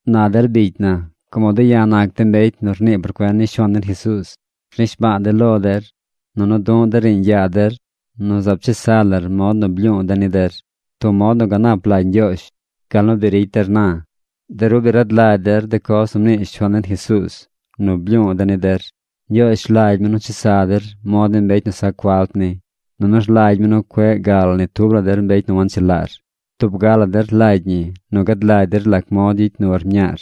Na der bicy na, como de̱ ya̱ nac de̱ mbecy nu rnii por cuen ni Shuaan den Jesuuz, rnishba̱a̱ de̱ lo der, nunu du̱ꞌ de̱ riiñ yaa der nu zaab chesa lar mod nu blyu̱u̱ de̱ ni der, tub mod nu ganap lagy Ñgyoozh, gal nu bi ricy der na. De ru bi rad lagy der de coz nu mnii Shuaan den Jesuuz nu blyu̱u̱ de̱ ni der. Ñgyoozh rlagy mi nu chesa der mod ni mbecy nu sac falt ni. Nunu rlagy mi nu cueꞌ gal ni tub la der mbecy nu wanchelaar. Tub ga la der rlagy ñi nu gad lagy der lac mod gyicy nur mñaar.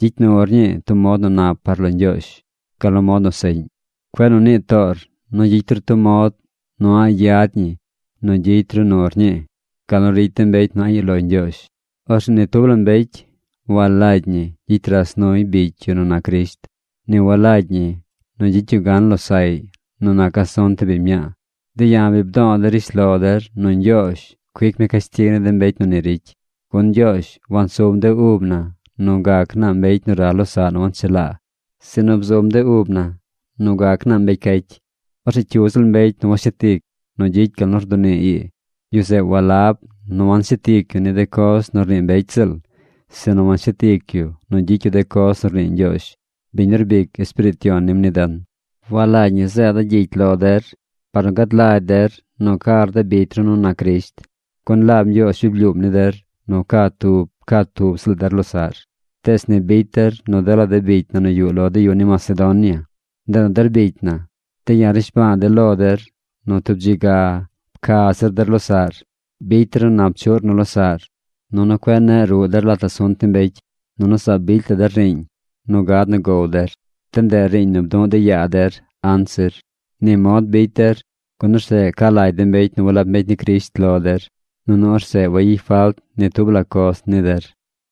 Gyicy nur ñii tub mod nu nap par lo Ñgyoozh, gal nu mod nu seꞌñ. Cueꞌ nu nii toor nu gyicy ru tub mod nu a̱ꞌ yad ñi nu gyicy ru nur ñii, gal nu ricy de mbecy nu a̱ꞌ yuꞌ lo Ñgyoozh. Orzeꞌ ni tub la mbecy walagy ñi gyicy ras nuy bicy yu nu nac Crisht. Ni walagy ñi nu gyicy yu gan losaꞌy nu nac asunt ni biñ mñaa. De̱ ya̱ bi bdo̱o̱ de̱ rishlo der nu Ñgyoozh cuic mi cashtig ni de mbecy nu ni ricy. Gun Ñgyoozh wansum de ub na nu gac naa mbecy nu ral losaꞌ nu wanchelaa, sinu bzum de ub na nu gac naa mbecy cacy. Orzeꞌ cyu ziꞌl mbecy nu washet ic nu gyicy gal nu rdunii ii, yu zeꞌ walab nu wacshet ic yu de coz nu rnii mbecy ziꞌl, sinu washet ic yu nu gyicy yu de coz nu rnii Ñgyoozh, biñ nu rbic Espiriit Yon nim ni den. Walagy ñi zeeda̱ gyicy lo der par nu gad lagy der nu car de bicy ru nu nac Crisht, gun laab Ñgyoozh bi blyuum ni der nu ca tub ca tub ziꞌl der losaꞌr. Tees ni bicy der nu dela de bicy na nu yuꞌ lo de yu ni Macedonia. Ndeꞌ nu der bicy na, de̱ ya̱ rnishba̱a̱ de̱ lo der nu tub dzi ga pca zir der losaꞌr. Bicy der nu nap chuꞌr nu losaꞌr. Nunu cueꞌ neꞌ ruꞌ der lat asunt ni mbecy. Nunu zaab bicy la der riiñ nu gad nu gow der. De ndeꞌ riiñ nu bduꞌ de̱ yaa der anzir. Ni mod bicy der, gun orzeꞌ ca lagy de mbecy nu walab mbecy ni Crisht lo der, nunu orzeꞌ wayicy falt ni tub la coz ni der.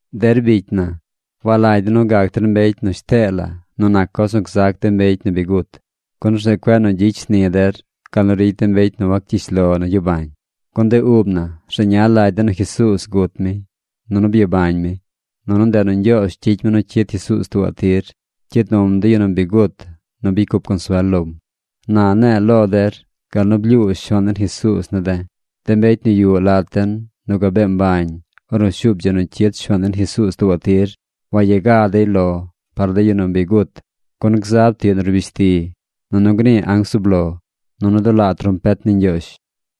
Der bicy na, walagy de̱ nu gac der mbecy nu shtee la nu nac coz nu gzac de mbecy nu bi gut, gun orzeꞌ cueꞌ nu gyicy shni der gal nu ricy de mbecy nu wacyish lo nu gyabañ. Gun de ub na rzeña lagy den nu Jesuuz gut mi, nunu byabañ mi. Nunu ndeꞌ nu Ñgyoozh gyicy mi nu cyid Jesuuz tuubaꞌ tir. Cyid num de yu nu bi gut nu bicy cup consuel lom. Na ne̱e̱ lo der gal nu blyuu Shuaan den Jesuuz ne̱ de̱. De mbecy nu yuꞌ lat den nu gabee mbañ ornu shuub dzi nu cyid Shuaan den Jesuuz tuubaꞌ tir, waya ga dey lo par de yu nu bi gut. Gun gzab tiꞌ nu rbish ti, nunu gnii anc zub lo, nunu dulaa trompet ni Ñgyoozh.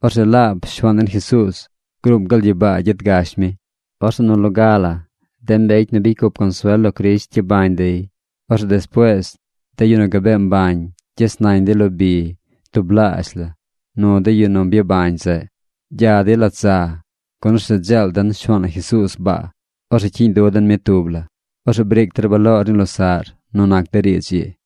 Orzeꞌ laab Shuaan den Jesuuz gruum gal gyibaa gyet gash mi. Orzeꞌ nu loga la de mbecy nu bicy cup consuel lo Crisht gyabañ dey. Orzeꞌ despuees de yu nu gabee mbañ gyes nañ dey lo bi tublaazh la nu de yu nu byabañ zeꞌ. Gya dey lat za. Gun orzeꞌ dzeel den Shuaan na Jesuuz baa. Orzeꞌ cyiiñ du den mi tub la. Orzeꞌ briic der baloor ni losaꞌr nu nac de riidz ii.